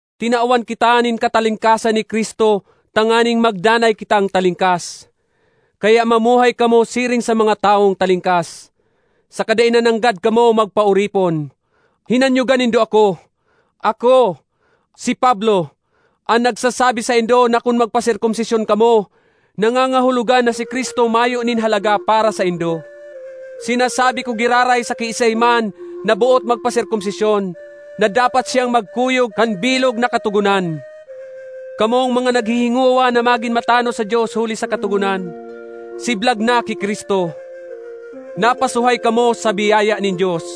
Tinawan kita nin katalingkasan ni Cristo tanganing magdanay kitang talingkas. Kaya mamuhay kamo siring sa mga tawong talingkas, saka dai na nanggad kamo magpaoripon. Hinanyoga nindo ako! Ako, si Pablo, an nagsasabi saindo na kun magpaserkomsisyon kamo, nangangahulogan na si Cristo mayo nin halaga para saindo. Sinasabi ko giraray sa kiisay man na boot magpaserkomsisyon, na dapat siyang magkuyog kan bilog na Katogonan. Kamong mga naghihingowa na magin matanos sa Dios huli sa Katogonan, siblag na ki Cristo. Napasuhay kamo sa biyaya nin Dios.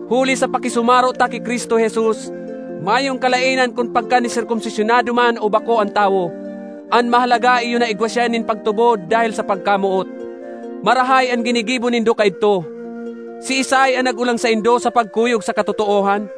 Huli sa pakisumaro ta ki Cristo Jesus, mayong kalaenan kun pagkaniserkomsisyonado man o bako an tawo; an mahalaga iyo na igwa siya nin pagtubod dahel sa pagkamoot. Marahay an ginigibo nindo kaidto! Siisay an nag-olang saindo sa pagkuyog sa katotoohan?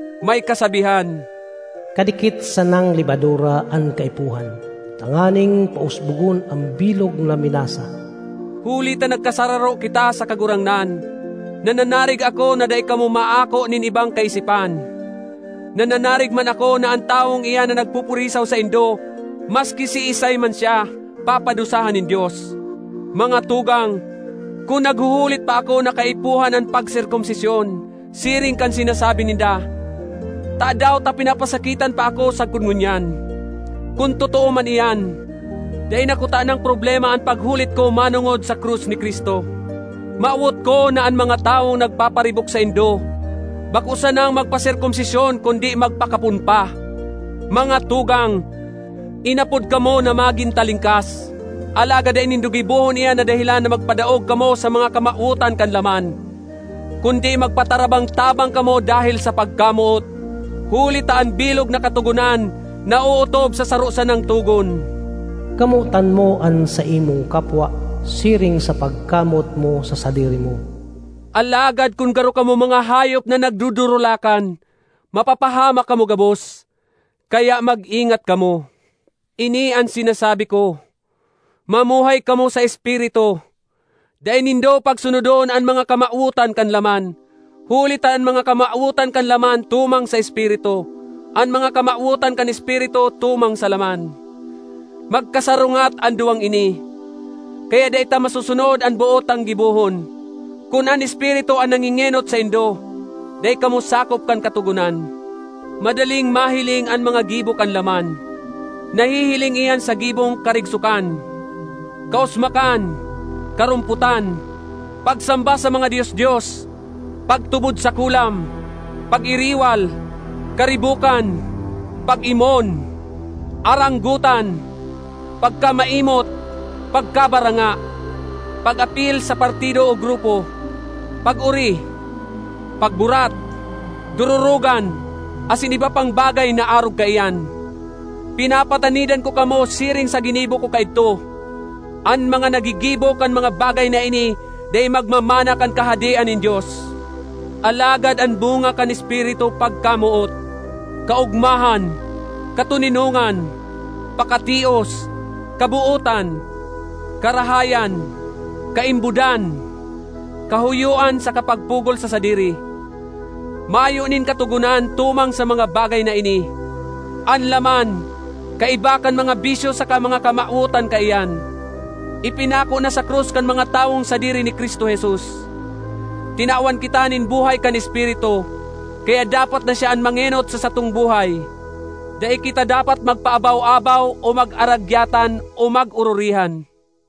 May kasabihan, “Kadikit sanang lebadura an kaipuhan tanganing pausbogon an bilog na minasa.” Huli ta nagkasararo kita sa Kagurangnan, nananarig ako na dai kamo maako nin ibang kaisipan; nananarig man ako na an tawong iyan na nagpupurisaw saindo, maski siisay man siya, papadusahan nin Dios. Mga tugang, kun naghuhulit pa ako na kaipuhan an pagserkomsisyon, siring kan sinasabi ninda, tadaw ta pinapasakitan pa ako sagkod ngunyan? Kun totoo man iyan, dai na kutanang problema an paghulit ko manongod sa krus ni Cristo. Mawot ko na an mga tawong nagpaparibok saindo bako sanang magpaserkomsisyon kundi magpakapon pa! Mga tugang, inapod kamo na magin talingkas. Alagad dai nindo gibohon iyan na dahelan na magpadaog kamo sa mga kamawotan kan laman. Kundi magpatarabang-tabang kamo dahel sa pagkamoot. Huli ta an bilog na Katogonan naootob sa saro sanang togon, “Kamotan mo an saimong kapwa siring sa pagkamoot mo sa sadiri mo.” Alagad kun garo kamo mga hayop na nagdudurulakan, mapapahamak kamo gabos. Kaya mag-ingat kamo. Ini an sinasabi ko: mamuhay kamo sa Espiritu; dai nindo pagsunodon an mga kamawotan kan laman. Huli ta an mga kamawotan kan laman tumang sa Espiritu; an mga kamawotan kan Espiritu tumang sa laman. Magkasarungat an duwang ini. Kaya dai ta masusunod an boot tang gibohon. Kun an Espiritu an nangengenot saindo, dai kamo sakop kan Katogonan. Madaling mahiling an mga gibo kan laman; nahihiling iyan sa gibong karigsokan, kausmakan, karompotan; pagsamba sa mga dios-dios, pagtubod sa kulam, pag-iriwal, karibokan, pag-imon, aranggotan, pagkamaimot, pagkabaranga, pag-apil sa partido o grupo; pag-ori, pagburat, dororogan, asin iba pang bagay na arog kaiyan. Pinapatanidan ko kamo siring sa ginibo ko kaidto: an mga naggigibo kan mga bagay na ini dai magmamana kan Kahadean nin Dios. Alagad an bunga kan Espiritu pagkamoot, kaogmahan, katoninongan, pakatios, kabootan, karahayan, kaimbodan; kahoyoan saka pagpugol sa sadiri. Mayo nin katogonan tumang sa mga bagay na ini. An laman, kaiba kan mga bisyo saka mga kamawotan kaiyan, ipinako na sa krus kan mga tawong sadiri ni Cristo Jesus. Tinawan kita nin buhay kan Espiritu, kaya dapat na siya an mangenot sa satong buhay. Dai kita dapat magpaabaw-abaw o mag-aragyatan o mag-ororihan.